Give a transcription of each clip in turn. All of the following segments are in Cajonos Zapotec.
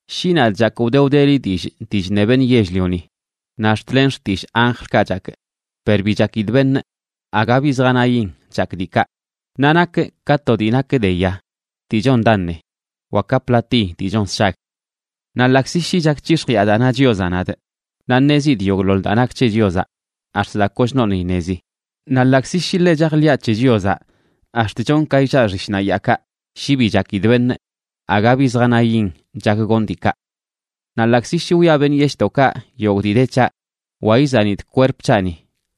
Shi nadꞌ chakꞌ wde wdeli dillꞌ dii chṉe beṉꞌ yell-lioni naꞌ ax̱t len xtillꞌ anjlkaꞌ chakꞌ, per bi chakidꞌ beṉꞌ, aga bi zjanayin chakꞌ diikaꞌ, naꞌ nakꞌ ka to dii nak de ya dii chon daṉe wa ka platiy dii chon sshag. Naꞌ ḻaꞌkzi shi chak c̱hix̱jiꞌa daa na Chiozaꞌ nadꞌ, naꞌ ṉezidꞌ yogꞌḻoḻ daa nak c̱he Chiozaꞌ ax̱t daa kochnoṉꞌ iṉezi, naꞌ ḻaꞌkzi shi ḻe chajḻiꞌa c̱he Chiozaꞌ ax̱t chonꞌ ka illaꞌ xishnaꞌ yaakaꞌ, shi bi chakidꞌ beṉꞌ, aga bi zjanayin chak gonꞌ diikaꞌ. Naꞌ ḻaꞌkzi shi wiꞌa beṉꞌ yeshꞌdoꞌkaꞌ yogꞌ dii de c̱haꞌ, wa izanidꞌ kwerp c̱haꞌni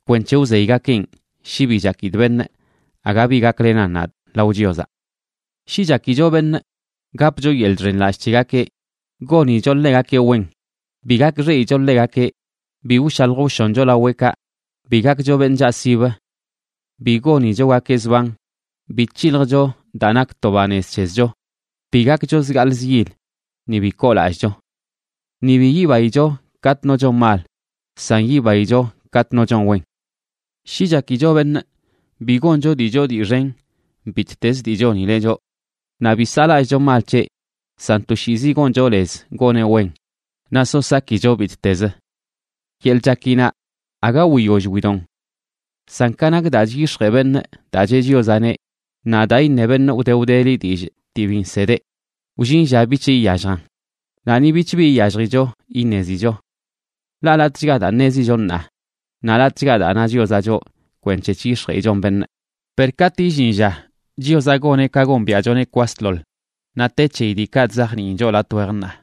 kwenc̱he wzeygakeꞌn, shi bi chakidꞌ beṉꞌ, aga bi gaklenan nadꞌ lao Chiozaꞌ. Shi chakicho beṉꞌ, gapcho yeḻꞌ chxenlallꞌ c̱hegakeꞌ, gonicho ḻegakeꞌ wen, bi gakxeꞌicho ḻegakeꞌ, bi wshalj wshoncho laweꞌkaꞌ, bi gakcho beṉꞌ chaꞌsibə, bi gonichogakeꞌ zban, bi c̱hiljcho daa nak to banez c̱hezcho, bi gakcho zgaaḻ zyil, ni bi koolallꞌcho. Ni bi yibaicho katꞌ no chon mal, san yibaicho katꞌ no chon wen. Shi chakicho beṉꞌ, bi goncho dii choo dii xen bittez dii chonileꞌ choꞌ, naꞌ bi saꞌlallꞌcho mal c̱heꞌ, san toshiizi goncho lez goneꞌ wen, naꞌ so sakicho bittezə. Yeḻꞌ chakinaꞌ aga wiyoll widon. San ka nak daa chyix̱jee beṉꞌ daa cheꞌ Chiozaꞌneꞌ, naꞌ daa iṉe beṉꞌ wde wdeli dillꞌ dii bi nsedeꞌ, wllin lla bich iyalljan, naꞌ ni bich bi iyalljicho iṉezicho. Ḻaꞌ latꞌchga daa ṉezicho ṉaa, naꞌ latꞌchga daa na Chiozaꞌ choꞌ kwenc̱he chyix̱jeꞌichon beṉꞌ, per katꞌ illin lla Chiozaꞌ goneꞌ ka gombiaꞌchoneꞌ kwasḻoḻ, naꞌ te c̱heyi diikaꞌ chzajniin choꞌ latꞌ wej ṉaa.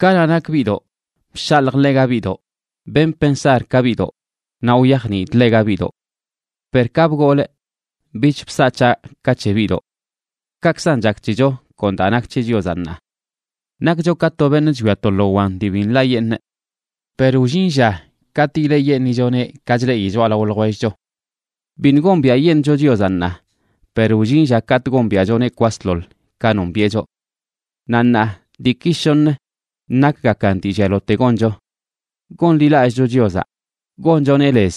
Kanaꞌ nakꞌ biꞌdoꞌ, bshaljꞌ ḻega biꞌdoꞌ, benꞌ pensar ka biꞌdoꞌ, naꞌ wyajniidꞌ ḻega biꞌdoꞌ. Per ka bgolꞌ bich bsaꞌ c̱haꞌ ka c̱he biꞌdoꞌ. Kaꞌkzan chak c̱hecho kon daa nak c̱he Chiozaꞌ ṉaa. Nakcho ka to beṉꞌ chwia to lo wan dii bi nḻaꞌyeṉꞌ. Per wllin lla katꞌ ileꞌyeṉꞌichoneꞌ ka chleꞌi choꞌalao ljwellcho. Biṉꞌ gombiaꞌyeṉꞌcho Chiozaꞌ ṉaa, per wllin lla katꞌ gombiaꞌchoneꞌ kwasḻoḻ ka nombiꞌe choꞌ. Naꞌ ṉaa diiki shoṉə nakgakan dii llialote goncho: gonḻilallꞌcho Chiozaꞌ, gonchoneꞌ lez,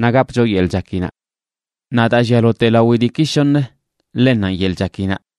naꞌ gapcho yeḻꞌ chakinaꞌ. Naꞌ daa llialote lawi diiki shoṉ, ḻennanꞌ yeḻꞌ chakinaꞌ.